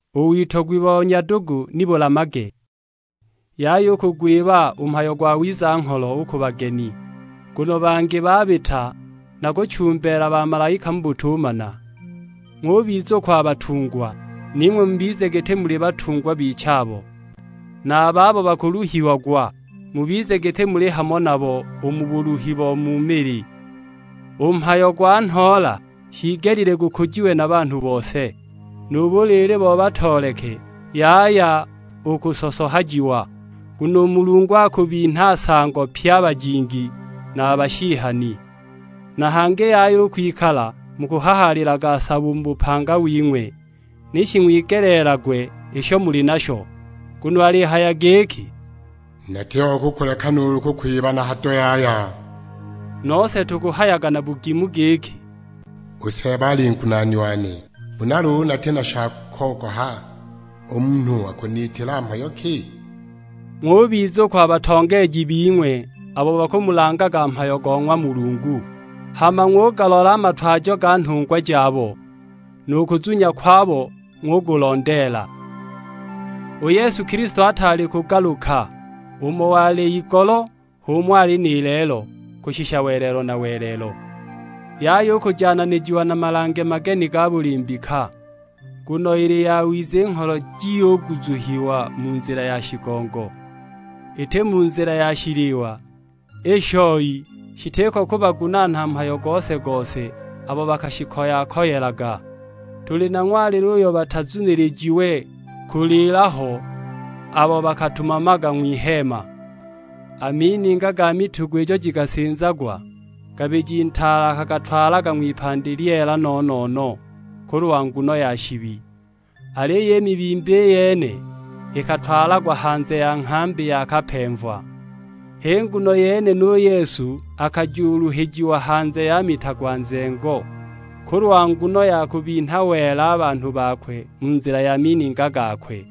U witogwi bo nyadugu ni bulamage. Yaya u kugwiba u mhayo go wiza-ngholo u ku bageni, nguno bangi babita na kuchumbeela bamalaika mu butumana. Ng'ubizukwa a batungwa, ning'we mubize giti muli batungwa bichabo, na a babo bakuluhiagwa; mubize giti muli hamo nabo u mu buluhi bo mu mili. U mhayo gwa nhoola shiigelile gukujiwe na banhu bose, nu buliili bo batooleke yaya u kusosohajiwa, nguno u Mulungu akubinha nsango pye a bajingi na a bashihani. Na hangi yaya u kwikala mukuhahaalilaga sabo u mu bupanga wing'we, ni shing'wigelagwe isho muli nasho. Nguno alihaya giki, "Natiko kukuleka nuulu kukwiba na hado yaya." Nose tukuhayaga na bugimu giki, "U Seeba ali ngunaani wane, huna luulu nati na sha kogoha, u munhu akuniitila mhayo ki?" Ng'ubizukwa a batongeeji bing'we abo bakumulangaga mhayo go ng'wa Mulungu, hama ng'ugalola a matwajo ga nhungwa jabo, nu kuzunya kwabo ng'ukulondeela. U Yesu Kilisto ataali kugaluka; umo wali igolo h'umo ali ni lelo, kushisha welelo na welelo. Yaya u kujananijiwa na malange mageni ga buli mbika, nguno ili yawiza i ngholo jiyuguzuhiwa mu nzila ya shigongo, iti mu nzila ya shiliwa; i shoi shitiko kubagunaana mhayo gose-gose abo bakashikoya-koyelaga. Tuli na ng'walilo uyo batazunilijiwe kuliila ho abo bakatumamaga ng'wiheema. A mininga ga mitugo ijo jikasinzagwa, Ngabiji Ntaale akagatwalaga ng'wipandi lyeela no-no-no, kulwa nguno ya shibi. Aliyo i mibimba i yene ikatwalagwa hanze ya nghambi yakapemva. H'i nguno yene nu Yesu akajuluhijiwa hanze ya mita gwa nzengo, kulwa nguno ya kubinha wela a banhu bakwe mu nzila ya mininga gakwe.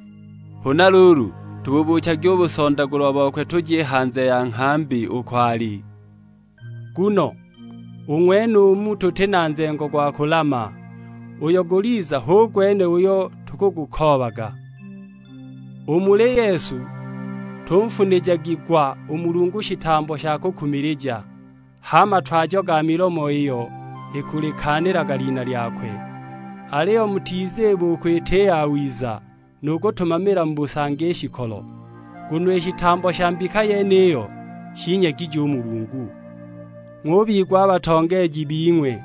Huna luulu, tububuuchagi u busondagulwa bokwe tuje i hanze ya nghambi uko ali. Nguno u ng'wenumu tuti na nzengo gwa kulama; uyo guliza hu gwene uyo tukugukoobaga. U muli Yesu tunfunijagi gwa u Mulungu shitambo sha kukumilija; h'a matwajo ga milomo iyo ikulikaanilaga lina lyakwe. Aliyo mutiziba u kwita i yawiza, nu kutumamila mu busangi i shikolo. Nguno i shitambo sha mbika yeniyo shinyegije u Mulungu. Ng'ubigwa a batongeeji bing'we,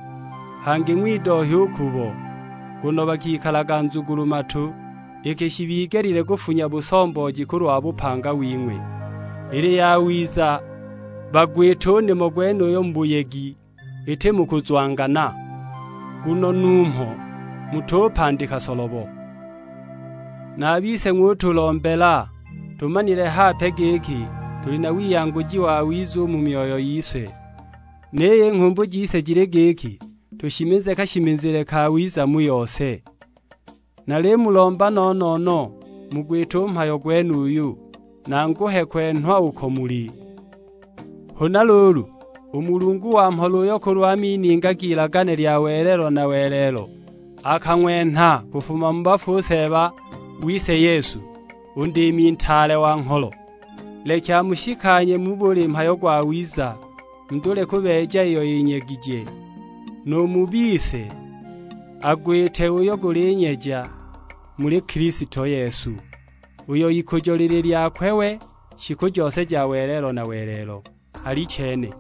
hangi ng'widohya u kubo, nguno bakikalaga nzugulu-matu, iki shibigelile kufunya busombooji kulwa bupanga wing'we. Ili yawiza bagwite u nimo gwenuyo mu buyegi, iti mu kuzwangana; nguno numho mutupandika solobo. Na a bise ng'utulombela, tumanile hape giki tuli na wiyanguji wawiza u mu myoyo yise, niyo i nghumbu jise jili giki tushimize kashimizile kawiza mu yose. Nalimulomba no-no-no mugwite u mhayo gwenuyu, nanguhe kwenhwa uko muli. Huna luulu, u Mulungu wa mhola uyo kulwa mininga g'ilagane lya welelo na welelo akang'wenha kufuma mu bafu u Seeba wise Yesu, u Ndiimi Ntaale wa ngholo, leki amushikanye mu buli mhayo gwawiza, mudule kubeeja iyo yinyegije; nu mu bise agwite uyo gulinyeja muli Kilisto Yesu; uyo ikujo lili lyakwe we, shiku jose ja welelo na welelo: Alichene.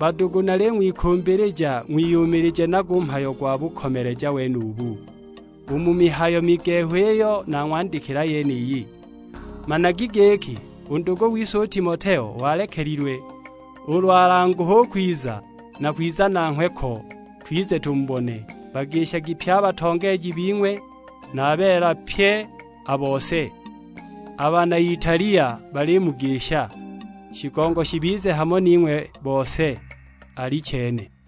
Badugu naling'wikumbilija ng'wiyumilije nago u mhayo gwa bukomeleja wenubu, u mu mihayo migehu iyo nang'wandikila yeniyi. Managi giki u ndugu wise u Timoteo walekelilwe, ulu alanguhe u kwiza, nakwiza nanghwe ko, twize tumubone. Bagishagi pye a batongeeji bing'we, na a beela pye a bose; a bana Italia balimugisha. Shigongo shibize hamo ning'we bose: Alichene.